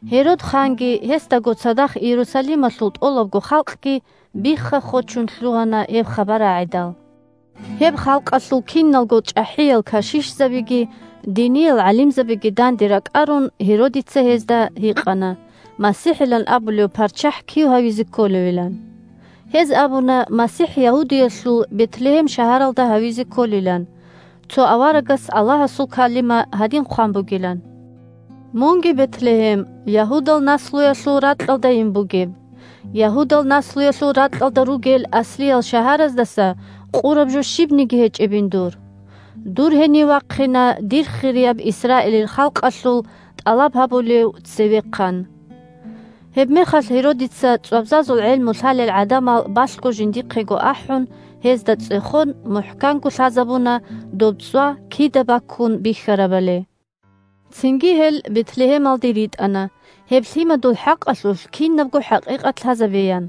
Гьерод ханги, гьесдаго цадахъ Иерусалималъул тӀолабго халкъги бихха-хочун лъугьана гьеб хабар рагӀидал. Гьеб халкъалъул киналго чӀахӀиял кашишзабиги диниял гӀалимзабиги данде ракӀарун, Гьеродица гьезда гьикъана МасихӀилан абулев парччахӀ кив гьавизе кколевилан. Гьез абуна МасихӀ Ягьудиялъул Бетлегьем шагьаралда гьавизе кколилан, цо аварагас Аллагьасул калима гьадин хъван бугилан: «Мунги, Бетлегьем, Ягьудал наслуялъул ракьалдайин бугеб, Ягьудал наслуялъул ракьалда ругел аслиял шагьараздаса къураб жо щибниги гьечӀебин дур. Дур гьенив вахъина Дир хирияб Исраилил халкъалъул тӀалаб гьабулев Цевехъан». Гьебмехалъ Гьеродица, цӀвабзазул гӀелму лъалел гӀадамал балъго жиндихъего ахӀун, гьезда цӀехон, мухӀканго лъазабуна доб цӀва кида баккун бихьарабали. Цинги гьел Бетлегьемалде ритӀана, гьеб лъимадул хӀакъалъулъ кинабго хӀакъикъат лъазабеян.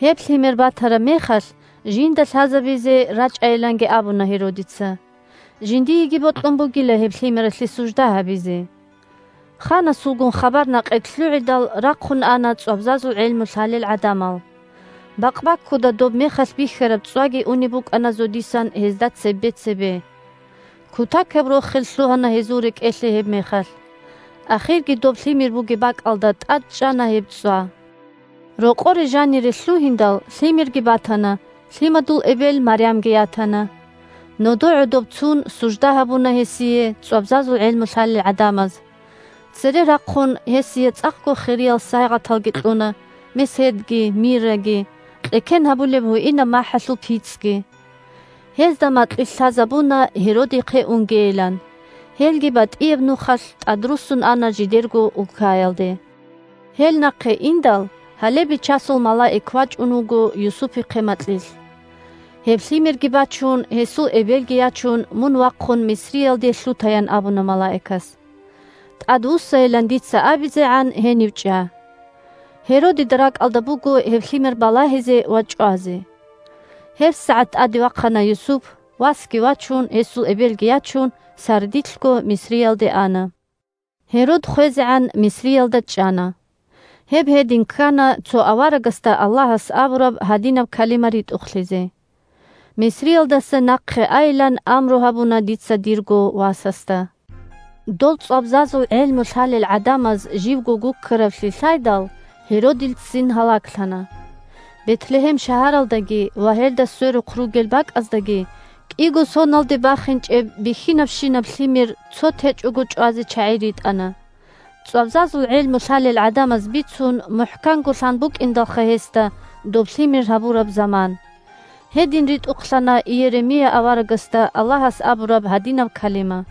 Гьеб Лъимер батараб мехалъ жинда лъазабизе рачӀайиланги абуна Гьеродица. Жиндиеги бокьун бугила гьеб Лъимералъе сужда гьабизе. Ханасулгун хабар-накъит лъугӀидал, рахъун ана цӀвабзазул гӀелму лъалел гӀадамал. Бакъбаккуда доб мехалъ бихьараб цӀваги унеб букӀана зодисан гьезда цебе-цебе. Кутакаб рохел лъугьана гьезул рекӀелъе гьебмехалъ. Ахирги доб лъимер бугеб бакӀалда тӀад чӀана гьеб цӀва. Рокъоре жанире лъугьиндал, лъимерги батана, лъимадул эбел Марямги ятана. Нодо гӀодоб цун сужда гьабуна гьесие цӀвабзазул гӀелму лъалел гӀадамаз. Цере рахъун, гьесие цӀакъго хириял сайигъаталги кьуна: меседги, мирраги Мирра – хварав чиясда бахунеб махӀгьуинаб нах., кьеккен гьабулеб гьуинаб махӀалъул пицӀги. Гьезда макьилъ лъазабуна Гьеродихъе унгейилан. Гьелги батӀияб нухалъ тӀадруссун ана жидерго улкаялде. Гьел нахъе индал, гьале Бичасул малаик вачӀун вуго Юсупихъе макьилъ. – Гьеб лъимерги бачун, гьесул эбелги ячун, мун вахъун Мисриялде лъуте, – ян абуна малаикас. – ТӀадвуссайилан дица абизегӀан гьенив чӀа. Гьеродида ракӀалда буго гьеб Лъимер балагьизе ва чӀвазе. ГьебсагӀат тӀаде вахъана Юсуп; васги вачун, гьесул эбелги ячун, сардилъго Мисриялде ана. Гьерод хвезегӀан Мисриялда чӀана. Гьеб гьедин ккана, цо аварагасда Аллагьас абураб гьадинаб калима ритӀухълъизе: «Мисриялдаса нахъе айилан амру гьабуна дица дирго васасда». Дол цӀвабзазул гӀелму лъалел гӀадамаз живго гуккаравлъи лъайдал, Гьеродил ццин гьалаглъана. Бетлегьем шагьаралдаги ва гьелда сверухъ ругел бакӀаздаги кӀиго соналде бахинчӀеб бихьинабщинаб лъимер цо течӀого чӀвазе чагӀи ритӀана. ЦӀвабзазул гӀелму лъалел гӀадамаз бицун, мухӀканго лъан букӀиндалха гьесда доб Лъимер гьабураб заман. Гьедин ритӀухълъана Иеремия аварагасда Аллагьас абураб гьадинаб калима: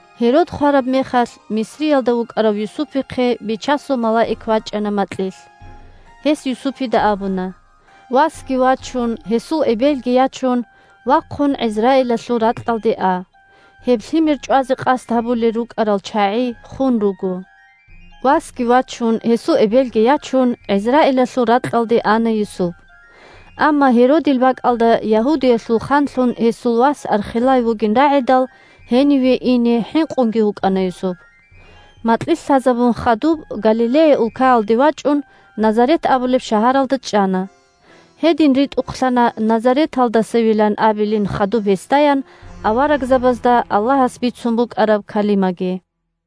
Гьерод хвараб мехалъ, Мисриялда вукӀарав Юсупихъе Бичасул малаик вачӀана макьилъ. Гьес Юсупида абуна: – Васги вачун, гьесул эбелги ячун, вахъун ГӀизраилалъул ракьалде а. Гьеб Лъимер чӀвазе къасд гьабулел рукӀарал чагӀи хун руго. Васги вачун, гьесул эбелги ячун, ГӀизраилалъул ракьалде ана Юсуп. Амма Гьеродил бакӀалда Ягьудиялъул ханлъун гьесул вас Архелай вугин рагӀидал, гьениве ине хӀинкъунги вукӀана Юсуп. Макьилъ лъазабун хадуб, Галилея улкаялде вачӀун, Назарет абулеб шагьаралда чӀана. Гьедин ритӀухълъана назареталдасевилан абилин хадуб гьесдаян аварагзабазда Аллагьас бицун букӀараб калимаги.